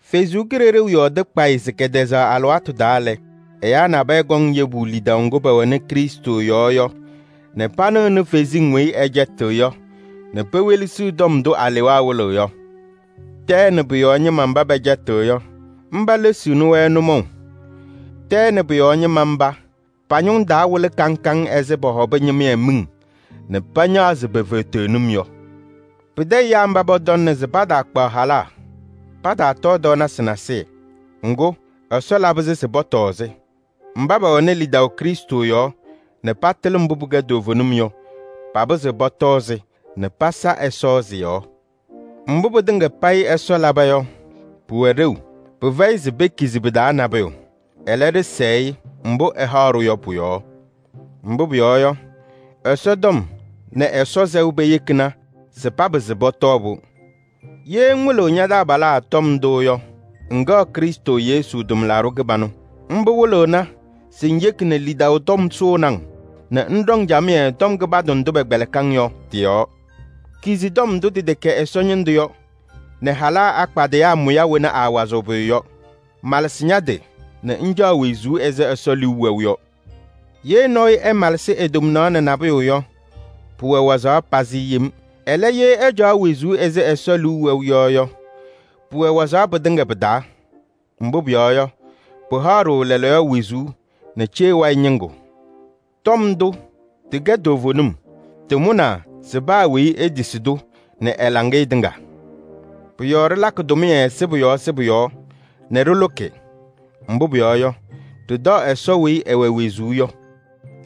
Ɛsɔ Kalɩzaɣ yɔɔdɩ kpayɩ se kɛtɛzaɣ alɩwaatʋ taa lɛ, ɛyaa nabɛyɛ kɔŋ yebu lidaʋ ŋgʋ pɛwɛnɩ Krɩstʋ yɔɔ yɔ nɛ panɩɣnɩ kalɩzasɩ nzɩ sɩcɛtɩɣ yɔ nɛ pewelesiɣ tɔm ndʋ alewaa wɩlɩɣ yɔ. Tɛɛ nɛ pʋ-yɔɔ ñɩma mba pɛcɛtɩɣ yɔ, pelesiɣni-wɛ nʋmɔʋ. Tɛɛ nɛ pʋ-yɔɔ ñɩma mba, pa-ñʋŋ taa wɩlɩ kaŋ kaŋ ɛzɩ pɔhɔbɩ ñɩmɩyɛ miŋ nɛ pañaɣzɩ pe-feteɣnim yɔ. Pɩtɛ ɛyaa mba pɔtɔŋnɩ se pataakpaɣ halaa, pataatɔɔ tɔɔnasɩ nasɩyɩ. Ŋgʋ, Ɛsɔ labɩ-sɩ se pɔtɔɔ-sɩ. Mba pɛwɛnɩ lidaʋ Krɩstʋ yɔɔ nɛ patɩlɩ mbʋ pɩkɛ toovenim yɔ, papɩzɩɣ pɔtɔɔ-sɩ nɛ pasa Ɛsɔ sɩ-yɔɔ. Mbʋ pɩtɩŋa payɩ Ɛsɔ laba yɔ, pʋwɛ ɖeu. Pɩfɛyɩ se pekizi pɩ-taa nabʋyʋ. Ɛlɛ, ɖɩsɛɛ-ɩ mbʋ ɛhaɣ-ɖʋ yɔ pʋ-yɔɔ. Mbʋ pʋyɔɔ yɔ, Ɛsɔtɔm nɛ Ɛsɔ sɛʋ peyekina se papɩsɩ pɔtɔɔ-pʋ. Ye ŋwɩlɩɣ ña-taabalaa tɔm ndʋ yɔ, ŋkɛɣ Krɩstʋ Yesu tʋmlaɖʋ kɩbanʋ. Mbʋ wɩlɩɣna se ŋyeki nɛ lidaʋ tɔm sʋʋnɩ-ŋ nɛ ŋɖɔŋ camɩyɛ tɔm kɩbandʋ ndʋ pɛkpɛlɩkɩ-ŋ yɔ tɩ-yɔɔ. Kizi tɔm ndʋ tɩtɛkɛ Ɛsɔ ñɩndʋ yɔ nɛ halaa akpadɩyaa mʋya wena aawazɩɣ pʋyʋ yɔ. Malɩsɩ ña-tɩ nɛ ŋcaɣ wezuu ɛzɩ Ɛsɔ liu wɛʋ yɔ. Ye nɔɔyʋ ɛmalɩsɩɣ e-tomnaɣ nɛ nabʋyʋ yɔ, pʋwɛ waɣzaɣ pazɩ yem. Ɛlɛ, ye ɛcaɣ wezuu ɛzɩ Ɛsɔ liu wɛʋ yɔ yɔ, pʋwɛ waɣzaɣ pɩtɩŋa pɩ-taa. Mbʋ pʋyɔɔ yɔ, pɩhaɣ-ɖʋ lɛɛlɛɛyɔ wezuu nɛ cee wayɩ ñɩŋgʋ. Tɔm ndʋ tɩkɛ toovenim. Tɩmʋnaa se paa weyi etisi-tʋ nɛ ɛ-laŋɩyɛ tɩŋa. Pʋ-yɔɔ ɖɩlakɩ tʋmɩyɛ sɩbʋ yɔɔ sɩbʋ yɔɔ nɛ ɖɩlʋkɩ. Mbʋ pʋyɔɔ yɔ, ɖɩtaɣ Ɛsɔ weyi ɛwɛ wezuu yɔ.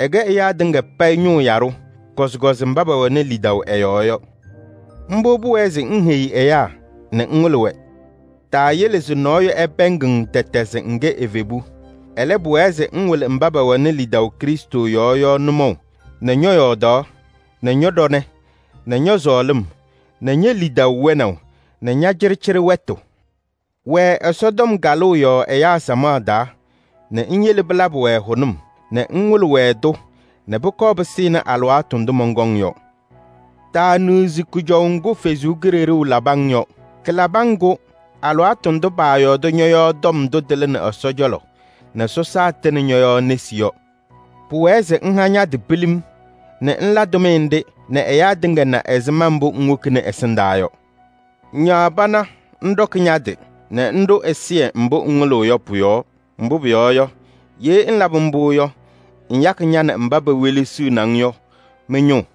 Ɛkɛ ɛyaa tɩŋa payɩ ñʋʋ yaɖʋ, kɔzɩkɔzɩ mba pɛwɛnɩ lidaʋ ɛ-yɔɔ yɔ. Mbʋ pʋwɛɛ se ŋheyi ɛyaa nɛ ŋwɩlɩ-wɛ. Taayele se nɔɔyʋ ɛpɛɛŋ-ŋ tɛtɛ se ŋkɛ evebu. Ɛlɛ, pʋwɛɛ se ŋwɩlɩ mba pɛwɛnɩ lidaʋ Krɩstʋ yɔɔ yɔ nʋmɔʋ nɛ ñɔ-yɔɔdaɣ nɛ ñɔ-ɖɔnɛ nɛ ñɔ-sɔɔlɩm nɛ ñe-lidaʋ wɛnaʋ nɛ ña-cɩɖɩcɩɖɩ wɛtʋ. Wɛɛ Ɛsɔtɔm kalʋʋ yɔɔ ɛyaa samaɣ taa nɛ ŋyele pɩlabɩ-wɛ hʋnʋm nɛ ŋwɩlɩ-wɛ-tʋ nɛ pʋkɔɔ pɩsɩnɩ alɩwaatʋ ndʋ mɔnkɔŋ yɔ. Taaniɣzi kʋjɔʋ ŋgʋ Ɛsɔ Kalɩzaɣ labɩ-ŋ yɔ. Kalabɩ-ŋ-kʋ alɩwaatʋ ndʋ paayɔɔdɩ ñɔ-yɔɔ tɔm ndʋ tɩlɩnɩ Ɛsɔ cɔlɔ nɛ sɔsaa tɩnɩ ñɔ-yɔɔ nesi yɔ. Pʋwɛɛ se ŋha ña-tɩ pilim nɛ ŋla tʋmɩyɛ nɖɩ nɛ ɛyaa tɩŋa na ɛzɩma mbʋ ŋwokini ɛsɩndaa yɔ. Ñaɣ pana ŋɖɔkɩ ña-tɩ nɛ ŋɖʋ ɛzɩyɛ mbʋ ŋwɩlɩɣ yɔ pʋ-yɔɔ. Mbʋ pʋyɔɔ yɔ, ye ŋlabɩ mbʋ yɔ, ŋyakɩ ña nɛ mba pewelesiɣni-ŋ yɔ mɩ-ñʋʋ.